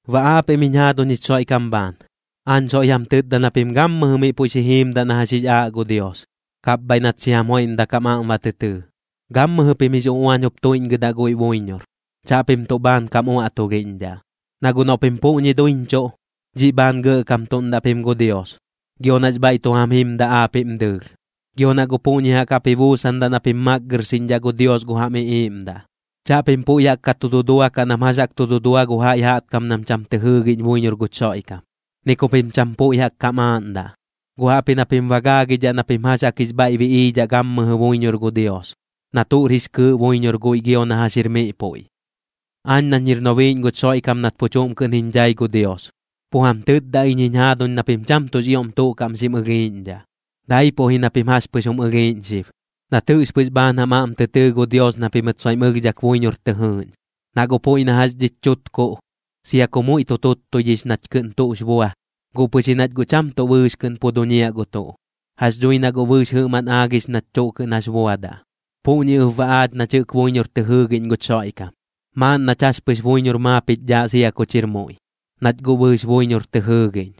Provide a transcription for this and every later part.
Baꞌ aapiꞌm jiñ jaaduñ jich Xoiꞌkam bhaan, aañ soiꞌ jam tɨtda na pim gammɨjɨ miꞌ puiꞌ xi jiimdaꞌ na jax jix aaꞌ gu Dios, kapbhaiꞌ nat xi jam joiꞌmdak jam aꞌm ba tɨ tɨɨ. Gammɨjɨ pim jix uꞌuañ jup tuiꞌñgɨdaꞌ guiꞌ buiñor, chaꞌpim tuꞌ bhaan kam uaꞌtulhiꞌñdhaꞌ. Na guꞌ noꞌ pim puꞌñi duiñchuꞌ, dhiꞌ bhaan gɇꞌkamtuꞌndaꞌ pim gu Dios, gio nax bhaiꞌ tu jam jimdaꞌ aapiꞌm dɨɨlh. Gio na guꞌ puꞌñi jaꞌk jaꞌp ji buusandaꞌ na pim makgɨrxiꞌñdhaꞌ gu Dios gu jam iꞌiiꞌmdaꞌ. Chaꞌpim puiꞌ jaꞌk ka tu duduakaꞌ nam jax jaꞌk tu dudua gu jaiꞌ jaꞌtkam nam cham tɨ jɨɨgiꞌñ buiñor guch Xoiꞌkam, ni ku pim cham puiꞌ jaꞌk kam aaꞌndaꞌ, guꞌ jaꞌpji na pim ba gaagidhaꞌ na pim jax jaꞌk jix bhaiꞌ biꞌiidhaꞌ gammɨjɨ buiñor gu Dios, na tuꞌr jix kɨɨꞌ buiñor guiꞌ gio na jax jir miꞌ puiꞌ. Aañ nañ jir nobiiꞌñ guch Xoiꞌkam nat pu chuꞌm kɨꞌn jiñ dhai gu Dios, pu jam tɨtda iñ jiñ jaaduñ na pim cham tuꞌx ioꞌm tuꞌ kaꞌm xim ɨlhiiꞌñdhaꞌ, daipuꞌ ji na pim jax pɨx jum ɨlhiiꞌñ xib, nat jɨꞌx pɨx bhaan jam aꞌm tɨ tɨɨ gu Dios na pimɨt soiꞌm ɨlhdhak buiñor tɨ jɨɨꞌñ. Na guꞌ puiꞌ na jax dhich chutkuꞌ, sia ku muiꞌ tuttuidhix nach kɨꞌn tuꞌx bua, guꞌ pɨx ji nach guꞌ cham tuꞌ bɨɨx kɨꞌn pu duñiaꞌ gu tuꞌ. Jax dhui na guꞌ bɨɨx jɨꞌmaꞌn aagix nach tuꞌ kɨꞌn jax buadaꞌ. Puꞌñi ɨp baꞌ aach nach jɨꞌk buiñor tɨ jɨɨgiꞌñ guch Xoiꞌkam, maaꞌn nach jax pɨx buiñor maap jich dhaaꞌ sia kuch jir muiꞌ, nach guꞌ bɨɨx buiñor tɨ jɨɨgiꞌñ.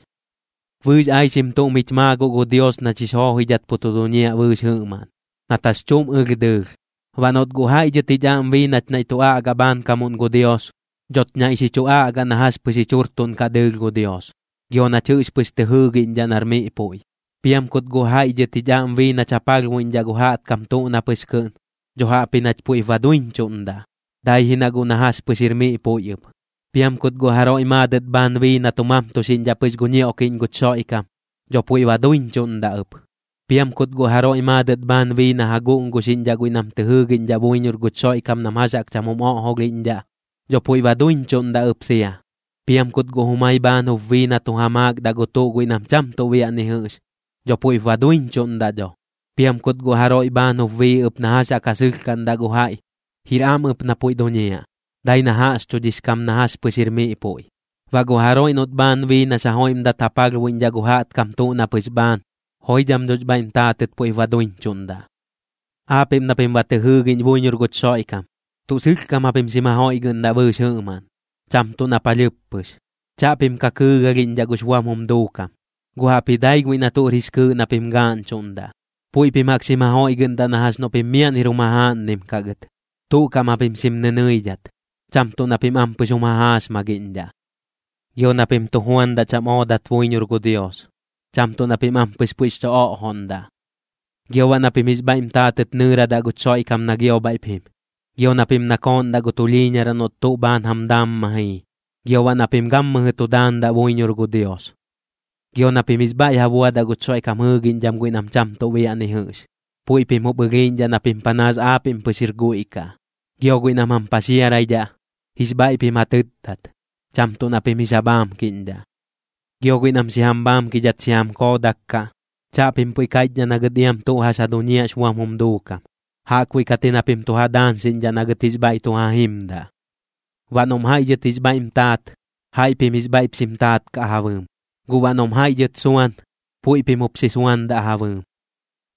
Bɨɨx aixim tuꞌm jich maa guꞌ gu Dios nach jix joojoidhat pu tu duñiaꞌ bɨɨx jɨꞌmaꞌn, nat jax chuꞌm ɨlh dɨɨlh. Baꞌ noꞌt guꞌ jaiꞌ dhɨt jich aꞌm bii nach naiꞌ tu aꞌgaꞌ bhaankamuꞌn gu Dios, dhoch naiꞌ xi chu aꞌgaꞌ na jax pɨx jich jurtuꞌnkaꞌ dɨɨlh gu Dios, gio nach jɨꞌx pɨx tɨ jɨɨgiꞌñdhaꞌ nar miꞌ puiꞌ. Piam kut guꞌ jaiꞌ dhɨt jich aꞌm bii nach ja palhbuiꞌñdhaꞌ gu jaꞌtkam tuꞌ na pɨx kɨꞌn, dho jaꞌpji nach puiꞌp ba duiñchuꞌndaꞌ, dai ji na guꞌ na jax pɨx jir miꞌ puiꞌ ɨp. Piam kut guꞌ jaroiꞌ maadɨt bhaan bii na tu mamtuxiꞌñdhaꞌ pɨx gu ñioꞌkiꞌñ guch Xoiꞌkam, dho puiꞌ ba duiñchuꞌndaꞌ ɨp. Piam kut guꞌ jaroiꞌ maadɨt bhaan bii na ja guꞌnguxiꞌñdhaꞌ guiꞌ nam tɨ jɨɨgiꞌñdhaꞌ buiñor guch Xoiꞌkam nam jax jaꞌk cham jum oꞌjolhiꞌñdhaꞌ, dho puiꞌ ba duiñchuꞌndaꞌ ɨp sia. Piam kut guꞌ jumai bhaan jup bii na tu ja maakdaꞌ gu tuꞌ guiꞌ nam cham tuꞌ biaꞌ ni jɨꞌx, dho puiꞌp ba duiñchuꞌndaꞌ dho. Piam kut guꞌ jaroiꞌ bhaan jup bii ɨp na jax jaꞌk ja sɨlhkaꞌndaꞌ gu jaiꞌ, jir am ɨp na puiꞌ duñiaꞌ, dai na jaꞌxchudhix kam na jax pɨx jir miꞌ puiꞌ. Baꞌ gu jaroiꞌ noꞌt bhaan bii nax ja joiꞌmdat ja palhbuiꞌñdhaꞌ gu jaꞌtkam tuꞌ na pɨx bhaan, joidham dhox bhaiꞌm taatɨt puiꞌp ba duiñchuꞌndaꞌ. Aapiꞌm na pim ba tɨ jɨɨgiꞌñ buiñor guch Xoiꞌkam, tuꞌ sɨlhkam japim xim ja joiꞌgɨꞌndaꞌ bɨɨx jɨꞌmaꞌn, cham tuꞌ na palhɨɨp pɨx. Chaꞌpim ka kɨɨgalhiꞌñdhaꞌ gux buam jum duukam, guꞌ jaꞌpji dai guiꞌ na tuꞌr jix kɨɨꞌ na pim gaaꞌñchuꞌndaꞌ. Puiꞌ pim jaꞌk xim ja joiꞌgɨꞌndaꞌ na jax noꞌ pim miaꞌn jir jum jajaaꞌnnim kaꞌ gɨt. Tuꞌ kaꞌm japim xim nɨnɨidhat, cham tuꞌ na pim ampɨx jum jajaaxmagiꞌñdhaꞌ. Gio na pim tu juandaꞌ cham oodat buiñor gu Dios, cham tuꞌ na pim ampɨx puiꞌx chu oꞌjoꞌndaꞌ. Gio baꞌ na pim jix bhaiꞌm taatɨt nɨɨradaꞌ guch Xoiꞌkam na gio bhaiꞌp jim. Gio na pim nakooꞌndaꞌ gu tulhiiñaraꞌ noꞌt tuꞌ bhaan jam daam ma jii. Gio baꞌ na pim gammɨjɨ tu daandaꞌ buiñor gu Dios. Gio na pim jix bhaiꞌ ja buadaꞌ guch Xoiꞌkam jɨɨgiꞌñdham guiꞌ nam cham tuꞌ biaꞌ ni jɨꞌx, puiꞌ pim jum ɨlhiiꞌñdhaꞌ na pim panaas aapiꞌm pɨx jir guiꞌ kaꞌ. Gio guiꞌ nam jam paxiaraidhaꞌ, jix bhaiꞌ pim ja tɨtdat, cham tuꞌ na pim jix ja bhaamkiꞌñdhaꞌ. Gio guiꞌ nam xi jam bhaamkidhat xi jam koodak kaꞌ, chaꞌpim puiꞌ kaiꞌchdhaꞌ na gɨt iam tuꞌ na pɨx ja duñiaꞌx buam jum duukam, jaꞌkbuiꞌ kat ji na pim tu ja daañxiꞌñdhaꞌ na gɨt jix bhaiꞌ tu ja jimdaꞌ. Baꞌ noꞌm jaiꞌ dhɨt jix bhaiꞌm taat, jaiꞌ pim jix bhaiꞌp xim taat kaꞌ ja bɨɨm. Guꞌ baꞌ noꞌm jaiꞌ dhɨt suan, puiꞌ pim jup xi suandaꞌ ja bɨɨm.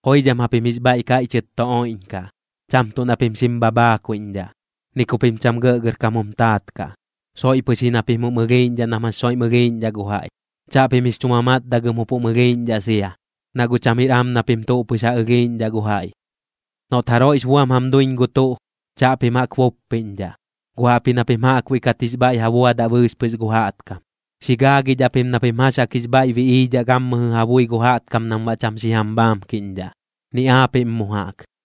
Joidham japim jix bhaiꞌ kaiꞌchɨt tu oiꞌñkaꞌ, cham tuꞌ na pim xim bhabhaakuiꞌñdhaꞌ. Ni ku pim cham gɇꞌgɇrkam jum taat kaꞌ, soiꞌ pɨx ji na pim jum ɨlhiiꞌñdhaꞌ nam jax soiꞌm ɨlhiiꞌñdhaꞌ gu jaiꞌ. Chaꞌpim jix chu mamatdagɨm jup jum ɨlhiiꞌñdhaꞌ sia, na guꞌ cham jir am na pim tuꞌ pɨx ja ɨlhiiꞌñdhaꞌ gu jaiꞌ. Noꞌt jaroiꞌx buam jam duiñ gu tuꞌ, chaꞌpim jaꞌk buppiꞌñdhaꞌ, guꞌ jaꞌpji na pim jaꞌkbuiꞌ kat jix bhaiꞌ ja buadaꞌ bɨɨx pɨx gu jaꞌtkam. Xi gaagidhaꞌ pim na pim jax jaꞌk jix bhaiꞌ biꞌiidhaꞌ gammɨjɨ ja bui gu jaꞌtkam nam baꞌ cham xi jam bhaamkiꞌñdhaꞌ, ni aapiꞌm mu jaꞌk.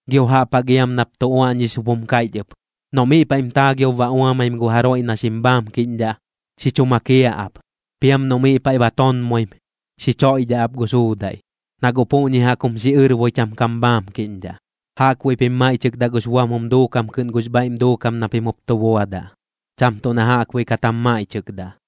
Gio jaꞌp jaꞌk iam nap tu uaꞌñix jup jum kaiꞌch ɨp: “Noꞌ miꞌ paiꞌm taagiob ba uamaim gu jaroiꞌ na xim bhaamkiꞌñdhaꞌ, xi chu makiaꞌ ap. Piam noꞌ miꞌ paiꞌ ba tonmoim, xi choiꞌdhaꞌ ap gu suudaiꞌ. Na guꞌ puꞌñi jaꞌk jum xiꞌɨrboi cham kam bhaamkiꞌñdhaꞌ.” Jaꞌkbuiꞌ pim maiꞌchɨkdaꞌ gux buam jum duukam kɨꞌn gux bhaiꞌm duukam na pim jup tu buadaꞌ, cham tuꞌ na jaꞌkbuiꞌ kat jam maiꞌchɨkdaꞌ.